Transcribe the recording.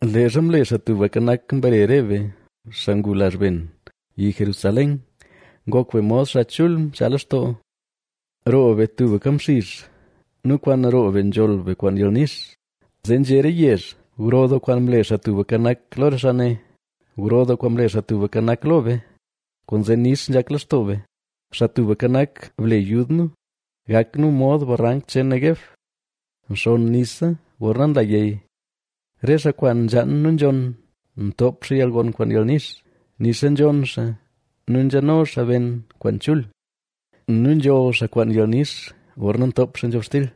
Leezha mle Xaa Tubka Nak, mbare re be, xaa ngu lazh ben, Yi Jerusalén, ngok be mod xaa chul mchaa lextoo. Roo be tubka mxizh, nu kwaan roo be nzholl be kwaan yalnix. Zee nzhé re yezh: “Gro doo kwaan mle Xaa Tubka Nak, lo re xaa ne.” Gro doo kwaan mle xaa Tubka Nak lo be, kwaanzee nix nzhak lextoo be. Xaa Tubka Nak, ble yud nu, gak nu mod barank cheen Neguev, nxonn nisa gorna nla yey. Re xaa kwaan nzhaan nu nzhonn, ntoop xaa yalgon kwaan yalnix. Nixa nzhonn xaa nu nzhano xaa ben kwaan chul nu nzholl xaa kwaan yalnix gorna ntoop xaa nzhobxtil.